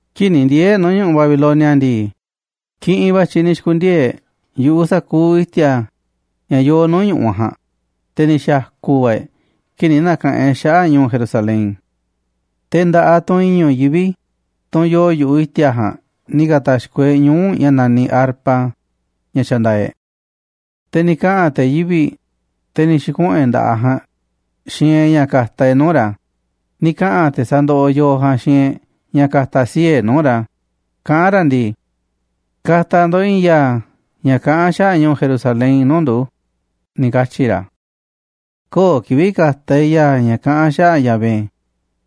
Kii̱ꞌ ni̱ ndiee̱ e̱ꞌ nuu̱ꞌ Babilonia ndii, kiꞌinꞌ va̱ i̱tyiꞌ ni̱ xi̱ku̱ndiee̱ e̱ꞌ yu̱ꞌuꞌ sa̱kuuꞌ i̱ti̱a̱ ña̱ yoo nuu̱ꞌ ñu̱ꞌuꞌ ja̱a̱nꞌ, te̱ ni̱ xa̱ku̱ va̱ e̱ꞌ kii̱ꞌ ni̱ na̱ka̱ꞌanꞌ e̱ꞌ xaꞌa̱ꞌ ñu̱u̱ Jerusalén. Te̱ nda̱ꞌaꞌ tunꞌ i̱ñu̱ꞌ yivi̱ꞌ, tunꞌ yoo yu̱ꞌuꞌ i̱ti̱a̱ ja̱a̱nꞌ, ni̱ ka̱ta̱xkoꞌ e̱ꞌ ñuu̱ꞌ ña̱ naniꞌ arpa, ña̱ xandaaꞌ e̱ꞌ. Te̱ ni̱ kaꞌa̱n te̱ yivi̱ꞌ, te̱ ni̱ xi̱kuꞌu̱n e̱ꞌ nda̱ꞌaꞌ ja̱a̱nꞌ xiinꞌ e̱ꞌ ña̱ ka̱ta̱ e̱ꞌ nuu̱ꞌ ra̱, ni̱ kaꞌa̱n te̱ sa̱ndoꞌoꞌ yooꞌ ja̱a̱nꞌ xiinꞌ e̱ꞌ ña̱ ka̱ta̱ sii̱ꞌ e̱ꞌ nuu̱ꞌ ra̱, kaꞌán ra̱ ndii: “Ka̱ta̱ ndo̱ꞌ i̱i̱n ya̱a̱ ña̱ kaꞌán xaꞌa̱ꞌ ñu̱u̱ Jerusalén nuu̱ꞌ ndu̱”, ni̱ katyi̱ ra̱. Köo̱ꞌ kivi̱ꞌ ka̱ta̱ e̱ꞌ ya̱a̱ ña̱ kaꞌán xaꞌa̱ꞌ Yahvé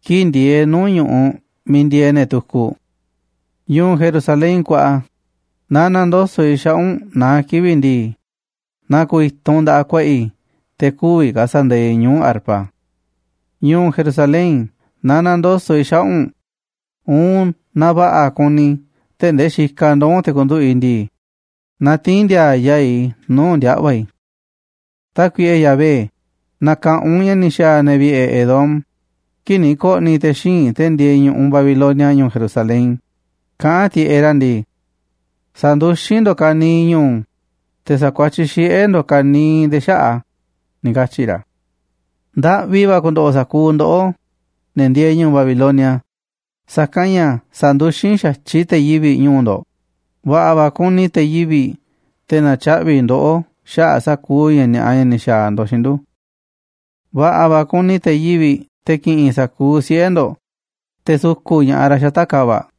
kii̱ꞌ ndieeꞌ e̱ꞌ nuu̱ꞌ ñu̱ꞌuꞌ miiꞌ ndieeꞌ ne̱ tukuꞌ. Ñu̱u̱ Jerusalén kuaꞌa, naaꞌ na̱ndoso̱ꞌ i̱ xaꞌa̱ꞌ u̱nꞌ naá kivi̱ꞌ ndii, na ku̱u̱ i̱tunꞌ nda̱ꞌaꞌ ku̱a̱ꞌa̱ i̱ te̱ kü̱vi̱ ka̱ sa̱ndaaꞌ i̱ ñuu̱ꞌ arpa. Ñu̱u̱ Jerusalén, naaꞌ na̱ndoso̱ꞌ i̱ xaꞌa̱ꞌ u̱nꞌ, uun naaꞌ va̱ꞌa̱ kuni i̱ tee̱ꞌ ndee xikaꞌ ndoo̱ u̱nꞌ te̱ ku̱nduꞌu̱ꞌ i̱ ndii, na tii̱n ndi̱a̱a̱ yaa̱ꞌ i̱ nuu̱ꞌ ndiaꞌva̱ i̱. Tákuiꞌe Yahvé, na̱ka̱ꞌanꞌ u̱nꞌ ña̱ ni̱ xa̱a̱ ne̱ vi̱ꞌe̱ Edom kii̱ꞌ ni̱ ko̱ꞌni̱ te̱ xíinꞌ, te̱ ndieeꞌ ñu̱ꞌuꞌ Babilonia, ñu̱u̱ Jerusalén, kaꞌán tiꞌeꞌ ra̱ ndii: “Sa̱nduxín ndo̱ꞌ ka̱niiꞌ ñu̱u̱, te̱ sa̱kuatyiꞌ xiꞌe̱ ndo̱ꞌ ka̱niiꞌ nde̱e̱ xaꞌa̱ꞌ a̱”, ni̱ katyi̱ ra̱. Ndaꞌvi va̱ ku̱ndo̱ꞌo̱ sa̱kuuꞌ ndoꞌó, ne̱ ndieeꞌ ñu̱u̱ Babilonia, sa̱kanꞌ ña̱ sa̱nduxín xa̱tyiꞌ te̱ yivi̱ꞌ ñu̱u̱ ndo̱ꞌ, va̱ꞌa̱ va̱ ku̱ni̱ te̱ yivi̱ꞌ, te̱ na̱tyaꞌvi̱ ndoꞌó xaꞌa̱ꞌ sa̱kuuꞌ ña̱ ni̱a̱ꞌa, ña̱ ni̱ xa̱a̱ ndo̱ꞌ xiinꞌ ndu̱. Va̱ꞌa̱ va̱ ku̱ni̱ te̱ yivi̱ꞌ, te̱ ki̱ꞌi̱n sa̱kuuꞌ siꞌe̱ ndo̱ꞌ, te̱ su̱ku̱ꞌ ña̱ꞌaꞌ ra̱ xata̱ꞌ ka̱va̱ꞌ.